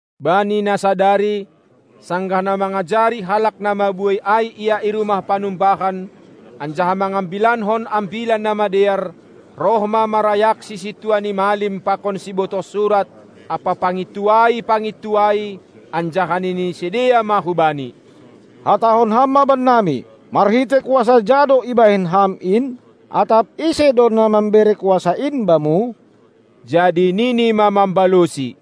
Bani na sadari, sanggah na mangajari halak na mabuei ai Ia i rumah panumbahan, anjaha mangambilankon Ambilan Namadear, roh ma marayakSi sintua ni malim pakon sibotoh surat ampa pangintuai-pangintuai, anjaha nini sidea ma hu Bani: Hatahon Ham ma bannami: Marhitei kuasa ja do ibahen Ham in? Atap: Ise do na mambere kuasa in Bamu? Jadi Nini ma mambalosi: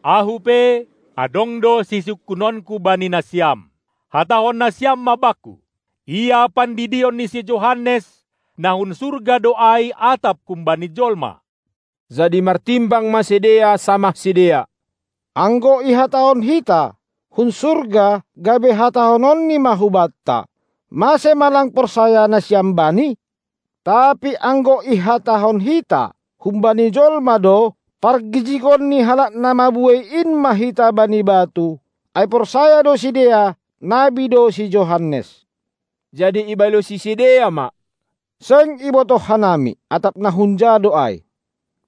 Ahu pe, adong do sisungkunonku bani nasiam. Hatahon nasiam ma Bakku. Ia pandidion ni si Johannes, na hun surga do ai, atap humbani jolma? Jadi martimbang ma sidea samah sidea: Anggo ihatahon hita: Hun surga, gabe hatahononni ma hubanta: Mase ma lang porsaya nasiam bani? Tapi anggo ihatahon hita: Humbani jolma do, pargijigon ni halak na mabuei in ma hita bani batu, ai porsaya do sidea, nabi do si Johannes. Jadi ibalosi sidea ma: Seng ibotoh hanami, atap na hunja do ai.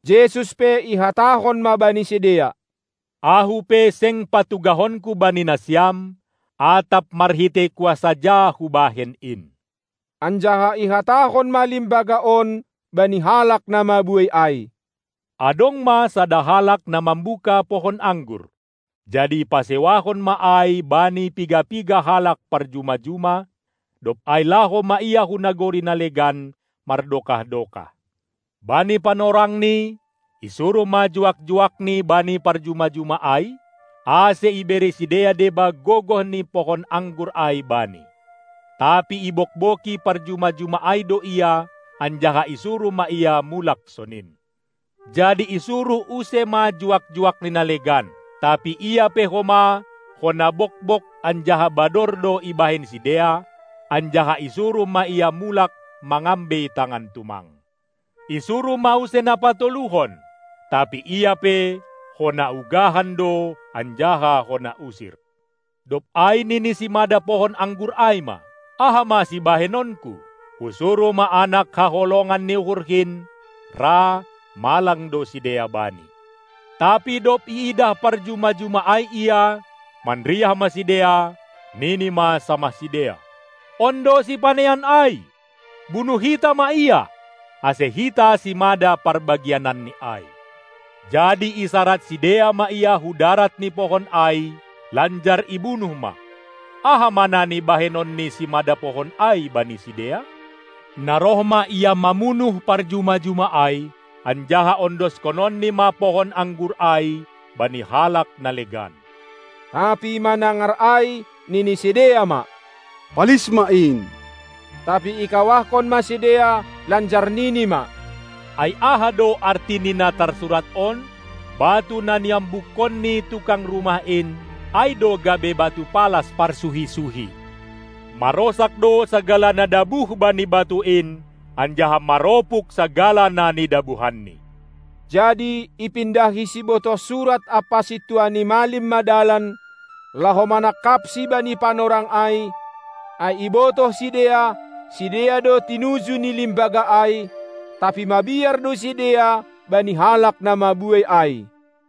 Jesus pe ihatahon ma bani sidea: Ahu pe seng patugahonku bani nasiam, atap marhitei kuasa ja Hubahen in. Anjaha ihatahon ma limbaga on bani halak na mabuei ai: Adong ma sada halak na mambuka pohon anggur, jadi ipasewahon ma ai bani piga-piga halak parjuma-juma, dob ai laho ma ia hu nagori na legan, mardokah-dokah. Bani panorangni isuruh ma juak-juakni bani parjuma-juma ai, ase ibere sidea deba gogoh ni pohon anggur ai bani. Tapi ibogbogi parjuma-juma ai do ia, anjaha isuruh ma ia mulak sonin. Jadi isuruh use ma juak-juakni na legan; tapi ia pe homa hona bogbog anjaha bador do ibahen sidea, anjaha isuruh ma ia mulak mangambei tangan tumang. Isuruh ma use na patoluhon, tapi ia pe hona ugahan do anjaha hona usir. Dob ai nini simada pohon anggur ai ma: Aha ma sibahenonku? Husuruh ma anak haholongan ni uhurhin, ra malang do sidea bani. Tapi dob iidah parjuma-juma ai ia, manriah ma sidea, nini ma samah sidea: On do sipanean ai. Bunuh hita ma ia, ase hita simada parbagiananni ai. Jadi isarad sidea ma ia hu darat ni pohon ai, lanjar ibunuh ma. Aha ma nani bahenon ni simada pohon ai bani sidea? Na roh ma ia mamunuh parjuma-juma ai, anjaha ondoskononni ma pohon anggur ai bani halak na legan. Tapi manangar ai, nini sidea ma: Palis ma in! Tapi ikawahkon ma sidea, lanjar nini ma: Ai aha do arti ni na tarsurat on: Batu na niambukkon ni tukang rumah in, ai do gabe batu palas parsuhi-suhi. Marosak do sagala na dabuh bani batu in, anjaha maropuk sagala na nidabuhanni. Jadi ipindahi sibotoh surat ampa sintua ni malim ma dalan, laho manangkapSi bani panorang ai, ai ibotoh sidea, sidea do tinuju ni limbaga ai, tapi mabiar do sidea bani halak na mabuei ai.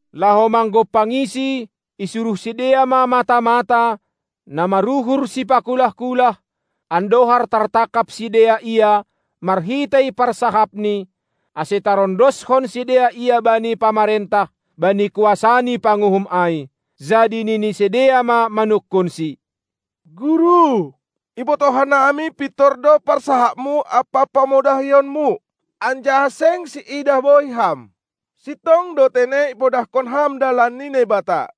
Laho manggompangiSi, isuruh sidea ma mata-mata, na maruhur sipakulah-kulah, andohar tartangkap sidea Ia marhitei parsahapni, ase tarondoskon sidea Ia bani pamarentah, bani kuasa ni panguhum ai. Jadi nini sidea ma manungkunSi: Guru, ibotoh hanami pintor do parsahapMu ampa pamodahionMu, anjaha seng siidah bohi Ham, sintong do tene ipodahkon Ham dalan ni Naibata.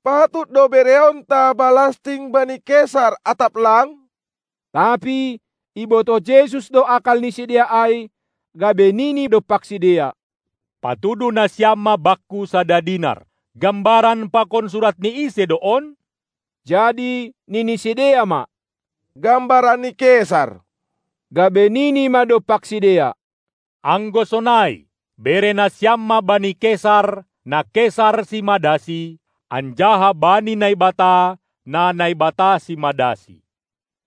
Patut do bereonta balasting bani Kesar, atap lang? Tapi ibotoh Jesus do akal ni sidea ai, gabe nini dompak sidea: Patuduh nasiam ma Bakku sada dinar! Gambaran pakon surat ni ise do on? Jadi nini sidea ma: Gambaran ni Kesar. Gabe nini ma dompak sidea: Anggo sonai, bere nasiam ma bani Kesar na Kesar simadasi, anjaha bani Naibata na Naibata simadasi.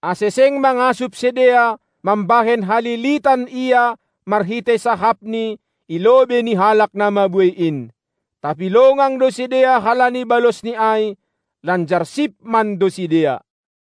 Ase seng mangasup sidea, mambahen halilitan Ia marhitei sahapNi i lobei ni halak na mabuei in. Tapi longang do sidea halani balosni ai, lanjar sip mando sidea.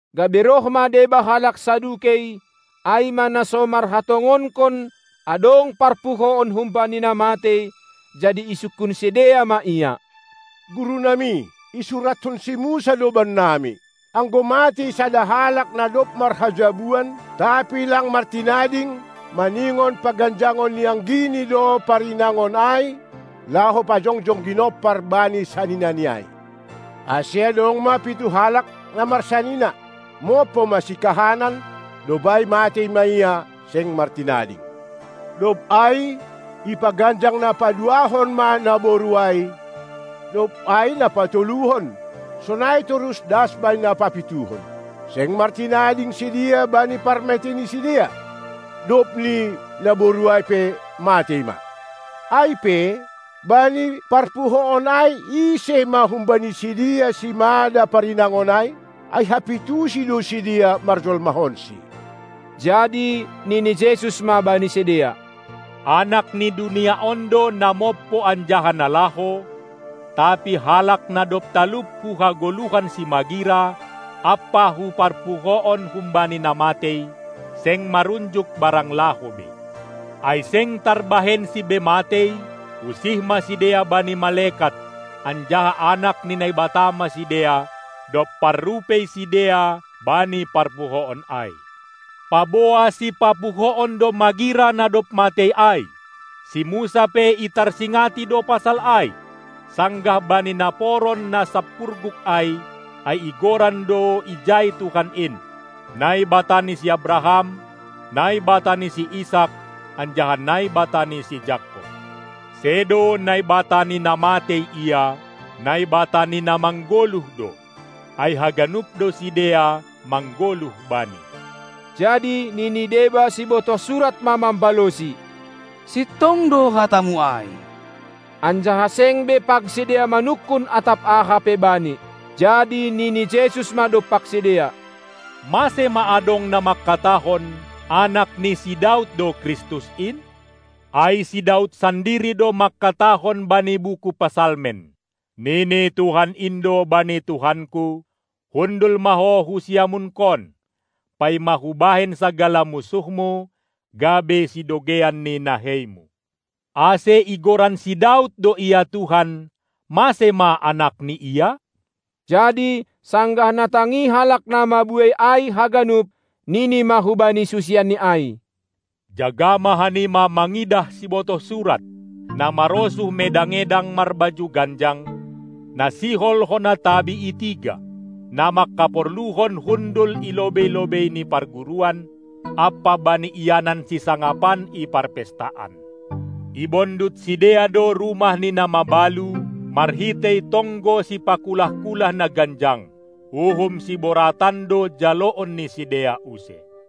Gabe roh ma deba halak Sadukei, ai ma na so marhatongonkon adong parpuhoon humbani na matei, jadi isungkun sidea ma Ia: Guru nami, isuratkon si Musa do bannami: Anggo matei sada halak na dob marhajabuan, tapi lang martinading, maningon paganjangon ni anggini do parinangon ai, laho pajongjong ginompar bani saninani ai. Ase adong ma pitu halak na marsanina. Mompo ma sikahanan, dob ai matei ma ia, seng martinading. Dob ai ipaganjang na paduahon ma naboru ai, dob ai na patoluhon, sonai torus das bani na papituhon. Seng martinading sidea bani parmatei ni sidea. Dobni naboru ai pe matei ma. Ai pe, bani parpuhoon ai, ise ma humbani sidea simada parinangon ai, ai hapitusi do sidea marjolmahonsi. Jadi nini Jesus ma bani sidea: Anak ni dunia on do na mompo anjaha na laho, tapi halak na dob talup hu hagoluhan simagira ampa hu parpuhoon humbani na matei, seng marunjuk barang laho be. Ai seng tarbahensi be matei, usih ma sidea bani malekat, anjaha anak ni Naibata ma sidea, dob parrupei sidea bani parpuhoon ai. Paboa sipapuhoon do magira na dob matei ai, si Musa pe itarsingati do pasal ai, sanggah bani naporon na sampurguk ai, ai igoran do ijai Tuhan in "Naibata ni si Abraham, Naibata ni si Isak anjaha Naibata ni si Jakob." Sedo Naibata ni na matei Ia, Naibata ni na manggoluh do, ai haganup do sidea manggoluh Bani. Jadi nini deba sibotoh surat ma mambalosi: Sintong do hataMu ai! Anjaha seng be pag sidea manungkun atap aha pe Bani. Jadi nini Jesus ma dompak sidea: Mase ma adong na mangkatahon, anak si Daud do Kristus in? Ai si Daud sandiri do mangkatahon bani buku Psalmen: Nini Tuhan in do bani Tuhanku: Hundul ma Ho hu siamunKon, paima Hubahen sagala munsuhMu gabe sidogeian ni naheiMu. Ase igoran si Daud do Ia Tuhan, mase ma anakni Ia? Jadi sanggah natangi halak namabuei ai haganup, Nini ma hubani susianNi ai: Jaga ma hanima mangidah sibotoh surat, na marosuh medang-edang marbaju ganjang, na sihol hona tabi i tiga, na mangkaporluhon hundul i lobei-lobei i parguruan ampa bani ianan sisangapan i parpestaan. Ibondut sidea do rumah ni na mabalu marhitei tonggo sipakulah-kulah na ganjang. Uhum siboratan do jaloon ni sidea use.